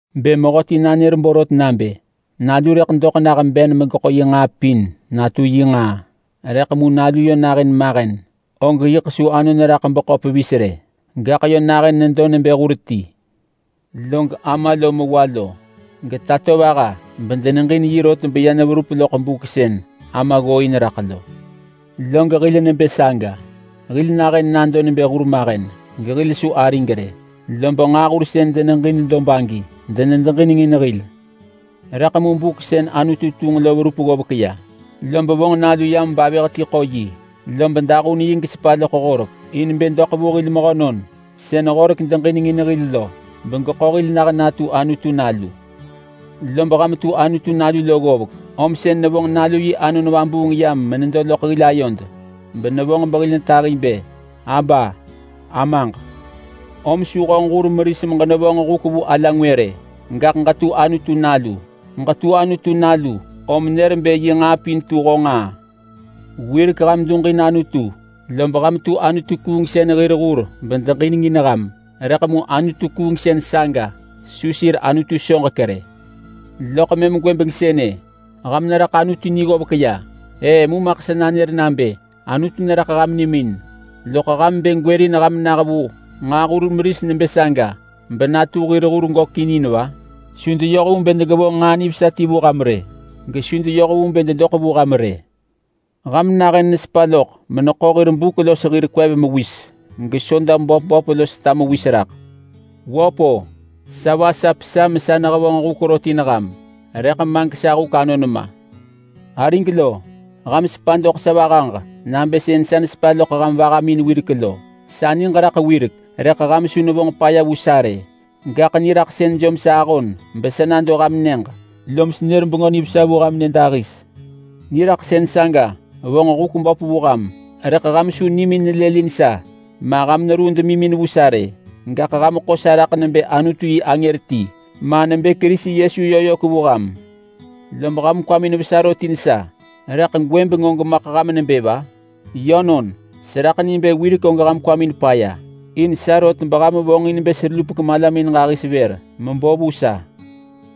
Bë mehöti nanër borot nabë nalu rëḳ doḳ nah ben megeḳo yi nġaa pin natu yi nġaa, rëḳ mu nalu yö nahën mahen, og yiḳ su anon raḳ beḳo pevis rë. Gaḳ yö nahën nedo nebë hur ti. Log ama lo mewa lo getatovaha bedeneġin yi rot beya neverup loḳ buk sën ama ggooin raḳ lo. Log hil nebë saga. Hil nahën nado nebë hurmahen gehil su arig rë, lob nġaahur sën deneġin dob agi denedeġinengin hil. Rëḳ mu buk sën Anutu tunġ lo verup ggovek ya, lob vonġ Nalu yam bavëh ti ḳo yi. Lob dahun yi gesepa loḳ Horek, in bë doḳ vu hil mehönon sën Horek deġinengin hil lo begeḳo hil nah natu Anutu nalu. Lob ham tu Anutu nalu ggovek, om sën nevonġ Nalu yi Anon Vabuung yam menedo loḳ hil ayod, benevonġ behil netahi bë, “Aba! nebë Amaġ!” Om su honġ hur meris meġenevonġ huk vu ala ngwë rë, gaḳ ġetu Anutu nalu. Ġetu Anutu nalu om nër bë yi nġaa pin tu honġ nġaa. Wirek ham duġin Anutu, lob ham tu anutu-kuungsën hir hur bedeneġin ham, rëḳ mu anutu-kuungsën saga su sir anutu soġek rë. Loḳ mëm gwëbeng sënë ham neraḳ Anutu ni ggovek ya-E mu maḳ sa nanër nabë Anutu neraḳ ham nimin-loḳ ham bë gwërin ham nah vu nġaahur meris nebë saga benatu hir hur gökin in va? Su deyoh vu bë degevonġ nġaa nivesa ti vu ham rë, gesu deyoh vu bë dedoḳ vu ham rë. Ham nahën nesepa loḳ meneḳo hir buk los hir kwev mewis gesoda böp böp los ta mewis raḳ. Wöp-o! Sa vasap sa mesa nehevonġ huk rot in ham rëḳ ma gesa huk anon ma! Arig lo! Ham sepa doḳ sa vahaġ nabë sën sa nesepa loḳ ham vahamin wirek lo. Sa niġ raḳ wirek rëḳ ham su nevonġ paya vu sa rë. Gaḳ niraḳsën jom sa ahon besa nado ham nyëġ, lom senër Bengö Nivesa vu ham nyëdahis. Niraḳsën saga vonġ huk böp vu ham, rëḳ ham su nimin nelëlin sa ma ham ruu demimin vu sa rë. Gaḳ ham ḳo sa raḳ nebë Anutu yi angër ti, ma nebë Kerisi Yesu yö yök vu ham. Lob ham kwamin vesa rot in sa, rëḳ gwëbeng og maḳ nebë va? Yönon! Seraḳ ni bë wirek og ham kwamin paya in sa rot beham vonġin bë selupek malamin ġahis vër mebo vu sa!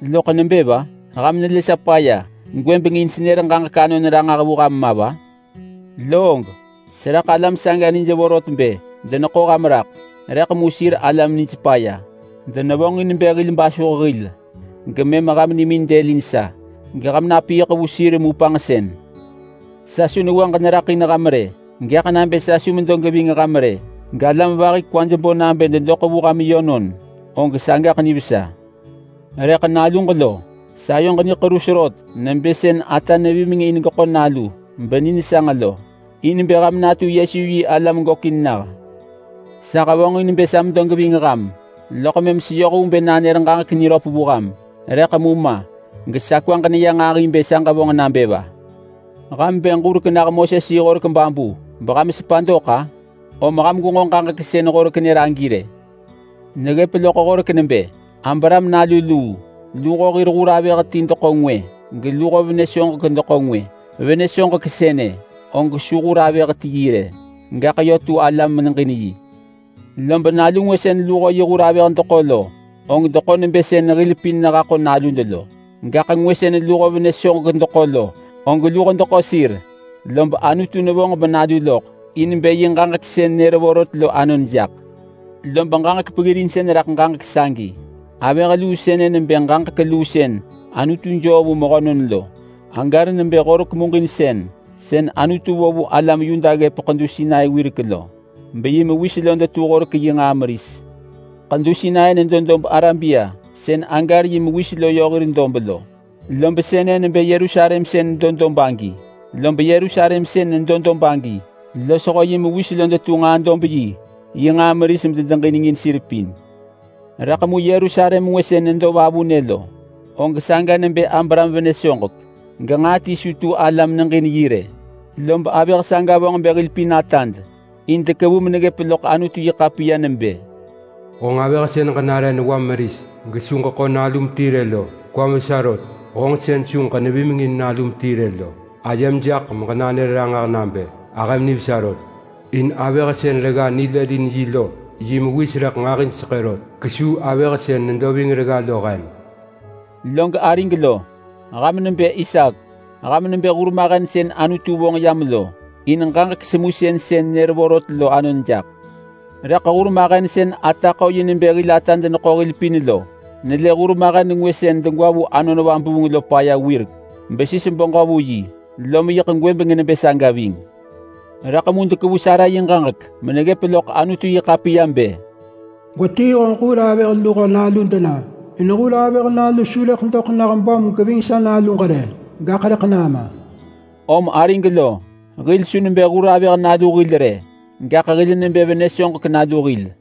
Loḳ nebë va? Ham nelë sa paya gwëbeng in senër ġaġek anon ranġah vu ham ma va? Loog seraḳ alam saga nij vorot bë deneḳo ham raḳ, rëḳ mu sir alam nij paya. Denevonġin bë hil basuh hil gemëm ham nimin dëlin sa geham napiiḳ vu sir mu panġsën. Sa su newaġ neraḳ in ham rë! Gaḳ nabë sa su medo geving ham rë galam vahi kwaj bo nabë dedoḳ vu ham yönon, og sagaḳ nivesa. Rëḳ naluġ lo! Sayoġ niḳerus rot nebë sën ata vimeng in nalu beni nesanġ lo, in bë ham natu Yesu yi alam gökin nah. Sa hevonġin bë sa medo geving ham loḳ mëm seyoh vu bë nanër ġaġek niröp vu ham. Rëḳ mu ma gesa kwaġ neya nġahi bë sa ġevonġ nabë va! Ham bë ġurek nah Moses-yi-horek babu beham sepa dok-a? Om ham gwenġo ġaġek sën Horek nër agi rë! Neggëp loḳ Horek nebë Abraham nalu luu. Luho yi hur avëh ti deḳo ngwë, geluho venë soġek yö deḳo ngwë. Venë soġek sënë og su hur avëh ti yi rë, gaḳ yö tu ala meneġin yi. Lob nalu ngwë sën luho yi hur avëh deḳo lo, og deḳo nebë sën hil pin nehaḳo nalud lo. Gaḳ ngwë sën luho venë soġek deḳo lo, og luho deḳo sir, lob Anutu nevonġ benalu loḳ in bë yi ġaġek sën nër vorot lo anon jaḳ. Lob ġaġek peggirinsën raḳ ġaġek sagi. Avëh luu sënë nebë ġaġek luu sën Anutu joo vu mehönon lo. Hagar nebë Horek muġinsën sën Anutu vo vu alam Yuda ggëp Ḳedu Sinai wirek lo, beyi mewis lo detu Horek yi nġaa meris. Ḳedu Sinai nedo dob Arabia sën Hagar yi mewis lo yö hir dob lo, lob sënë nebë Yerusalem sën nedo dob agi. Lob Yerusalem sën nedo dob agi, losho yi mewis lo detu nġaa-dob-yi yi nġaa meris bedeġinengin sir pin. Rëḳ mu Yerusalem ngwë sën nedo vavunë lo, og saga nebë Abraham venë soġek, genġaa ti su tu ala medeġinengin yi rë. Lob avëh saga vonġ bë hil pin atad. In dekevu meneggëp loḳ Anutu-yi-ḳapiya nebë: “Honġ avëh sën ġenare newam meris gesu ġeḳo nalum ti rë lo, kwam vesa rot! Honġ sën su ġenevimengin nalum ti rë lo. Ayem jaḳ meġenanër ranġah nabë ahëm nivesa rot! In avëh sën regga ni nelëlin yi lo yi mewis rëḳ nġahij seḳë rot kesuu avëh sën nedo ving regga lo hen.” Log arig lo! Ham nebë Isaak. Ham nebë hurmahen sën Anutu vonġ yam in bë ġaġek semusën sën nër vorot lo anon jaḳ lo. Rëḳ hurmahen sën ata ḳo yi nebë hil atad deneḳo hil pin lo nelë hurmahen ngwë sën degwa vu Anon Vabuung lo paya wirek besis beġö vu yi, lom yiḳ gwëbeng nebë saga ving. Rëḳ mu dekevu Sara yi ġaġek meneggëp loḳ Anutu-yi-ḳapiya bë, “Gwetii honġ hur avëh luho nalu dena in hur avëh nalu su rëḳ doḳ nah böm geving sa naluġ rë, gaḳ rëḳ nama!” Om arig lo, hil su nebë hur avëh nalu hil rë, gaḳ hil nebë venë soġek nalu hil.